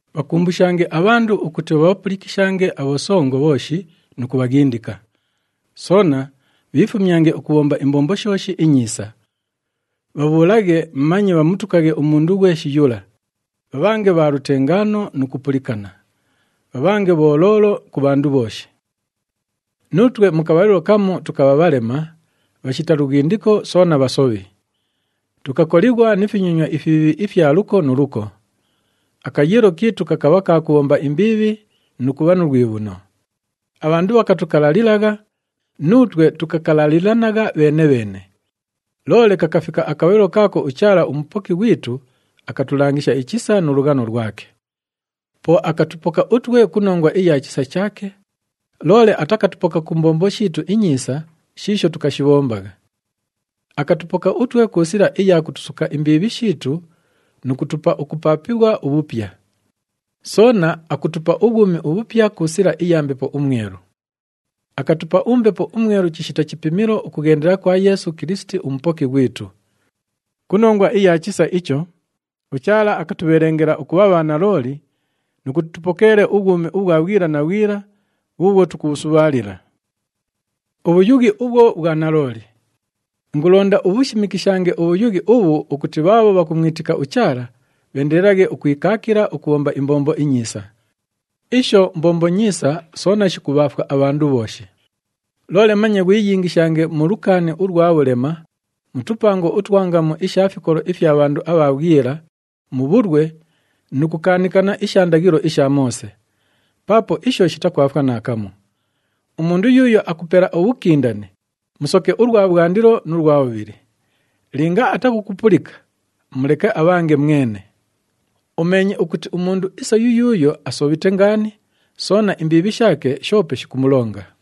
Bhakumbushange abhandu ukuti bhabhapulikishange abhosongo bhooshi nu kubhaghindika. Soona bhiifumyange ukubhomba imbombo shooshi inyiisa. Bhabhuulaghe manye bhamutukaghe umundu ghweshi yula, bhabhange bha lutengaano nu kupulikana. Bhabhange bholoolo ku bhandu bhooshi. Nuutwe mu kabhalilo kamu tukabha bhalema, bhashita lughindiko soona bhasobhi. Tukakolighwa ni finyonywa ifibhiibhi ifya luko nu luko. Akayiilo kiitu kakabha ka kubhomba imbiibhi nu kubha nu lwibhuno. Abhandu bhakatukalalilagha, nuutwe tukakalalilanagha bheene-bheene. Loole kakafika akabhalilo kaako uChaala uMupoki ghwitu akatulangisha ichisa nu lughano lwake. Po akatupoka utwe ku nongwa iya chisa chaake, loole atakatupoka ku mbombo shiitu inyiisa shiisho tukashibhombagha. Akatupoka utwe ku sila iya kutusuka imbiibhi shiitu nu kutupa ukupaapighwa ubhupya. Soona akutupa ubhwumi ubhupya ku sila iya Mbepo uMwelu. Akatupa uMbepo uMwelu chishita chipimilo ukughendela kwa Yeesu Kilisiti uMupoki ghwitu. Ku nongwa iya chisa icho, uChaala akatubhelengela ukubha bhanalooli nu kuti tupokeele ubhwumi ubhwa bhwila na bhwila bhuubhwo tukubhusubhaalila. Ubhuyughi ubhwo bhwa nalooli. Ingulonda ubhushimikishange ubhuyughi ubhu ukuti bhaabho bhakumwitika uChaala, bheendelelaghe ukwikaakila ukubhomba imbombo inyiisa. Isho mbombo nyiisa soona shikubhaafwa abhandu bhooshi. Loole manye ghwiyingishange mu lukaani ulwa bhulema, mu tupango utwa ngamu isha fikolo ifya bhandu abha bhwila, mu bhulwe nu kukaanikana isha ndaghilo isha Moose. Paapo isho shitakwafwa naakamu. Umundu yuuyo akupela ubhukindane, musoke ulwa bhwandilo nu lwa bhubhili. Linga atakukupulika, muleke abhange mwene. Umeenye ukuti umundu isa yuyuuyo asobhite ngaani, soona imbiibhi shaake shoope shikumulonga.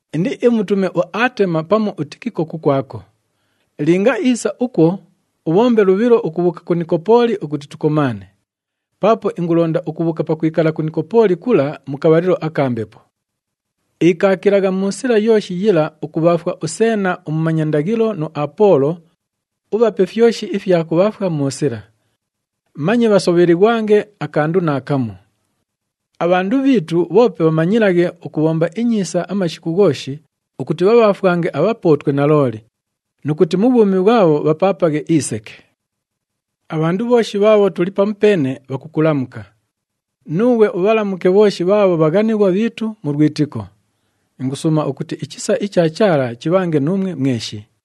Indiimutume uAtema pamu uTikiko kukwako. Linga iisa ukwo, ubhombe lubhilo ukubhuuka ku Nikopooli ukuti tukomaane, paapo ingulonda ukubhuuka pakwikala ku Nikopooli kula mu kabhalilo aka mbepo. Ikaakilagha mu sila yooshi yila ukubhaafwa uSeena umumanya ndaghilo nu Apoolo, ubhape fyoshi ifya kubhaafwa mu sila. Manye bhasobhelighwange akandu naakamu. Abhandu bhiitu bhoope bhamanyilaghe ukubhomba inyiisa amashiku ghooshi ukuti bhabhaafwange abhapootwe nalooli, nu kuti mu bhwumi bhwabho bhapaapaghe iseke. Abhandu bhooshi bhaabho tuli pamupeene, bhakukulamuka. Nuughwe ubhalamuke bhooshi bhaabho bhaghanighwa bhiitu mu lwitiko. Ingusuuma ukuti ichisa icha Chaala chibhange nuumwe mweshi.